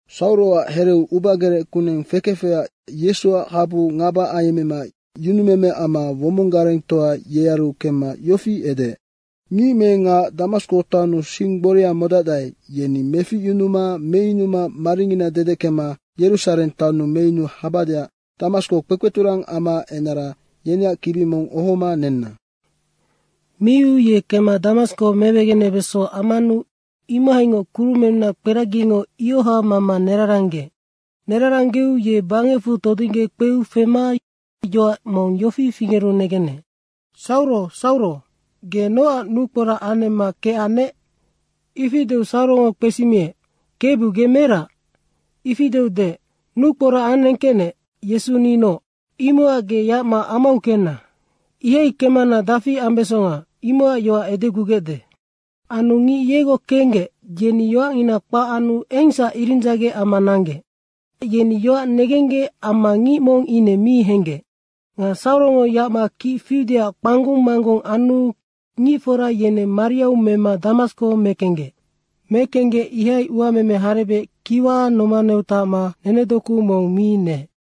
Sauroac hereu ubagerec kuneng fekefecac Yesuac habu ngaba ayemmema yunumeme amma womong garengtoa yearu kemma yofi edeec, “Ngic me ngac Damasko taonnu sing gboria modacdae, yeni meficyunuma meyunuma maringina dedeckema Yerusareng taonnu meyunu habadeac Damasko kpekpeturang amaac enara, yeneac kibi mong ohoma nenna.” Miu ye kemma Damasko mewegenebeso ammanu imohaingoc kurumennunac kperagingo ioha mama neraranggeec. Neraranggeu ye bangecfu todingge kpeu fema yoac mong yofi fingeru negenec, “Sauro, Sauro, ge nocac nukporac anemma kecannec?” ifi deu Saurongo kpesimiec, “Kebu ge merac?” ifi deu deec, “Nukporac anengkecnec, Yesu ninoc. Imocac ge yacma amau kenna! Ihai kecmana dafi ambesonga, imocac yoac edegugecde.” Anu ngic yegoc kenggec, yeni yoacngina kpac anu engsac iridzagec amma nanggec. Nocac yeni yoac negenggec amma ngic mong ine mi henggec. Nga Saurongo yacma kic fiudeac kpanggung manggung anu ngicfora yeneng mariau mema Damasko mekenggec. Mekenggec ihai uameme harebec kiwa nomaneu tacma nenedoku mong mi neec.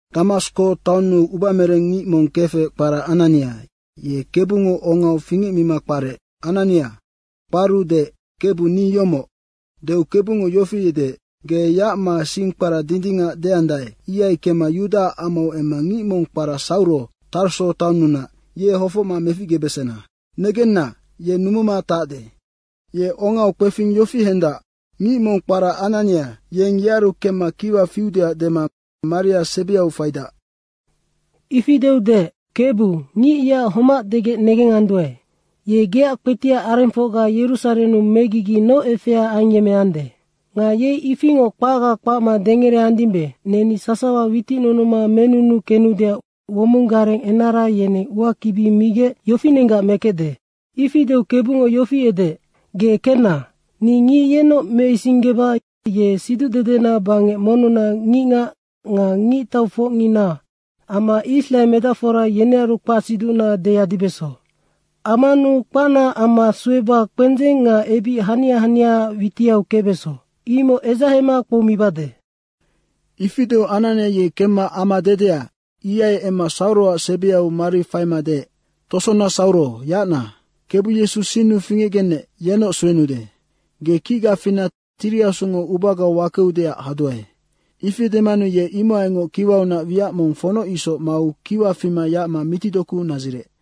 Damasko taonnu ubamereng ngic mong kefec kpara Anania, ye Kebungo ongau fingecmima kparec, “Anania.” kparu deec, “Kebu ni yomoc.” deu Kebungo yofi edeec, “Ge yacma sing kpara Dindingac deandae, ihai kemma Yudaac amau emma ngic mong kpara Sauro, Tarso taonnunac, ye hofocma meficgebesena. Negenna, ye numuma tacde. Ye ongau kpefing yofi hendac: Ngic mong kpara Anania, yeng yearu kemma kiwa fiudeac dema maria sebiau faidac.” Ifi deu deec, “Kebu, ngic yeac homac degec negenganduae. Ye geac kpetiac arengfocga Yerusarennu megigi noc efea ayemmeande. Nga yei ifingoc kpacga kpacma dengereandimbe, neni sasawa witicnunuma menunu kenudeac womong gareng enara yeneng uakibi migec yofinenggac mekecde.” Ifi deu Kebungo yofi edeec, “Ge kenna. Ni ngic yenoc meisinggeba ye siducdedena bangec monnunac ngicngac nga ngictaufocngina amma israe medacfora yenearu kpacsiducna deyadibeso. Ammanu kpacnaac amma sueba kpendzeng nga ebic hania haniaac witiau kecbeso, imoc edzahema kpoumibade.” Ifi deu Anania ye kemma ama dedea, ihai emma Sauroac sebiu maria faima deec, “Tosona Sauro, yacna. Kebu Yesu sinnu fingecgenec, yennoc suenude. Ge kicga fina Tiri Asungo ubagau wakeudeac haduae.” Ifi demanu ye imohaingoc kiwaunac wiac mong fonoc isoc mau kiwa fima yacma mitidoku nadzirec.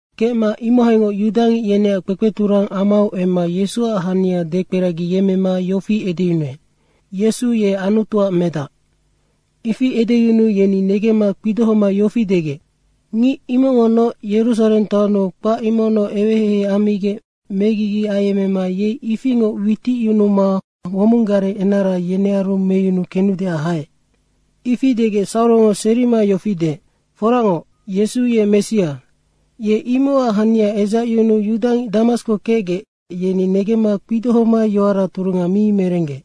Kecma imohaingoc yudangic yeneac kpekpeturang amau emma Yesuac hania dekperagiyemmema yofi edeyunuec, “Yesu ye Anutuac medac.” Ifi edeyunuu yeni negemma kpidohoma yofi degec, “Ngic imocngonoc Yerusareng taonnu kpac imocnoc eweheihei ammigec megigi ayemmema yei ifingoc witicyunuma womong gareng enara yenearu meyunu kenudeac haec.” Ifi degec Saurongo serima yofi deec, “Foracngoc, Yesu ye Messia.” Ye imocac hania edzacyunuu yudangic Damasko kecgec, yeni negemma kpidohoma yoara turunga mi merenggec.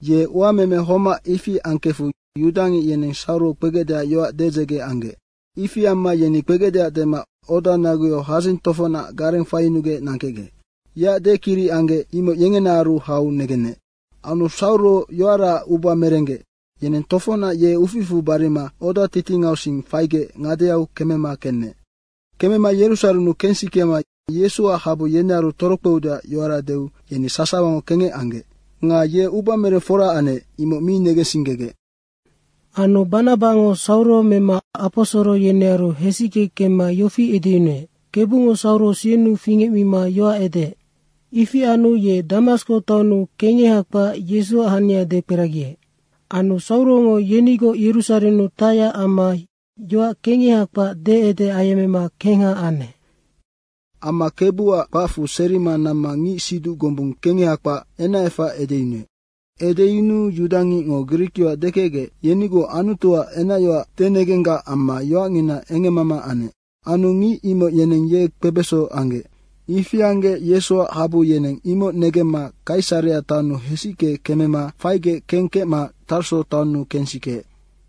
Ye uameme homac ifi angkefu yudangic yeneng Sauro kpegecdeac yoac dedzege anggec. Ifi amma yeni kpegecdeac dema oda naguyau hadzing tofocnac gareng faiyunugec nangkecgec. Yeac dekiric anggec, imoc yengenaaru hau negenec. Anu Sauro yoaraac uba merenggec, yeneng tofocnac ye uficfu barima oda titingau sing faigec ngadeau kemema kenec. Kemma Yerusarennu kensikema Yesuac habu yenearu torokpeudeac yoara deu yeni sasawango kengec anggec. Nga ye ubamereng fora anec, imoc mi negensinggegec. Anu Banabango Sauro mema aposoro yenearu hesicke kemma yofi edeyunuec, “Kebungo Sauro sinnu fingecmima yoac edeec. Ifi anu ye Damasko taonnu kengeha kpac Yesuac hania dekperagiec.” Anu Saurongo yenigoc Yerusarennu tacyac amma yoac kengeha kpac deede ayemmema kengha anec. Amma Kebuac kpacfu serima namma ngic siduc gombung kengeha kpac, enacefac edeyunuec. Edeyunuu yudangicngo grikyoac dekecgec, yenigoc Anutuac enacyoac denegenggac amma yoacngina engemmama anec. Anu ngic imoc yeneng ye kpebeso anggec. Ifi anggec Yesuac habu yeneng imoc negemma Kaisarea taonnu hesicke kemema faigec kengkecma Tarso taonnu kengsikeec.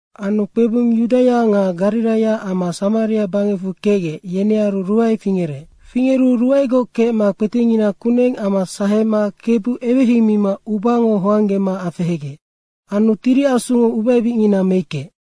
Anu kpebung Yudaia nga Gariraia amma Samaria bangecfu kecgec, yenearu ruae fingerec. Fingeru ruaegoc kecma kpetengina kuneng amma sahema Kebu eweheimima ubango hoanggema afehegec. Anu Tiri Asungo ubaebicngina meickeec.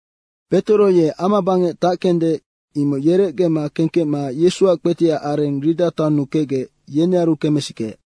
Petoro ye amabangec tackende, imoc yerecgema kengkecma Yesuac kpetiac areng Rida taonnu kecgec, yenearu kemesikeec.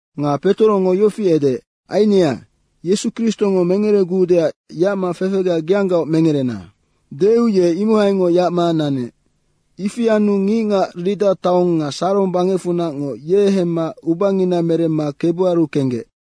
Nga Petorongo yofi edeec, “Ainea, Yesu Kristongo mengeregudeac yacma fefega geanggaoc mengerena.” deu ye imohaingoc yacma nanec. Ifi anu ngicngac Rida taong nga Sarong bangecfunacngo ye hemma ubangina meremma Kebuaru kenggec.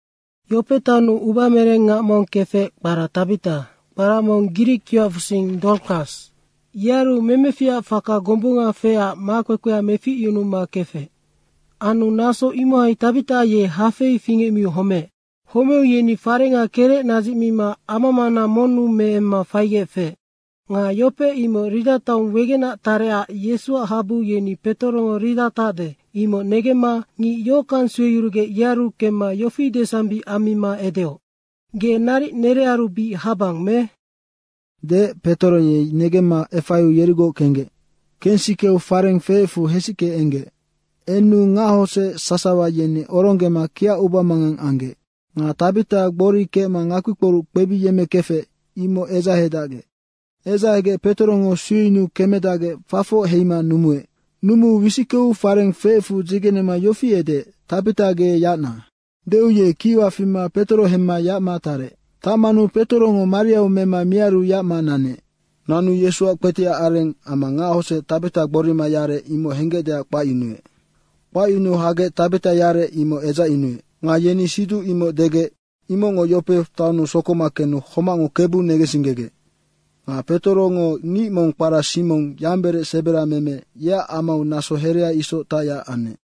Yope taonnu ubamereng ngac mong kefec, kpara Tabita, kpara grikyoacfusing Dorkas. Yearu memeficac faka gombunga feecac makpekpea meficyunuma kefec. Anu naso imohai Tabita ye hafei fingecmiu homeec. Homeu yeni farenga kerec nadzicmima amamana monnu meemma faigec feec. Nga Yope imoc Rida taong wegenac tarecac Yesuac habu yeni Petorongo Rida tacde, imoc negemma ngic yohockang sueyurugec yearu kemma yofi desambic ammima edeoc, “Ge naric nenearu bic habang me?” Deec Petoro ye negemma efaiu yerigoc kenggec. Kensikeu fareng feecfu hesicke enggec. Enu ngachodzec sasawa yeni oronggema kiacubamangang anggec. Nga Tabita gbori kecma ngakpikporuc kpebiyemmekefec, imoc edzahedacgec. Edzahegec Petorongo sueyunuu kemedacgec fafoc heima numuec. Numuu wisickeu farenga feecfu dzigenema yofi edeec, “Tabita ge yacna.” deu ye kiwa fima Petoro hemma yacma tarec. Tacmanu Petorongo mariau mema miaru yacma nanec. Nanu Yesuac kpetiac areng amma ngachodzec Tabita gborima yarec, imoc henggecdeac kpacyunuec. Kpacyunuu hagec Tabita yarec, imoc edzacyunuec. Nga yeni siduc imoc degec, imocngo Yope taonnu sokoma kenu homacngo Kebu negensinggegec. Nga Petorongo ngic mong kpara Simong, yamberec seberameme, yeac amau naso herea isoc tacyac anec.